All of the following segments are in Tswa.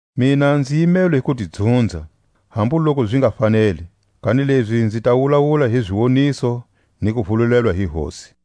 Mina nzi yimelwe hi ku ti dzunza, hambu loku zi nga faneli; kanilezi nzi ta wulawula hi ziwoniso, ni kuvululelwa hi Hosi.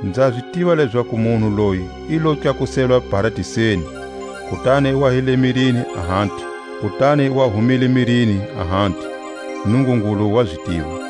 Nza zi tiva lezaku munhu loyi i lo tlakuselwa Paradiseni (kutani i wa hi le mirini, ahati; kutani i wa humile mirini, ahati; Nungungulu wa zi tiva);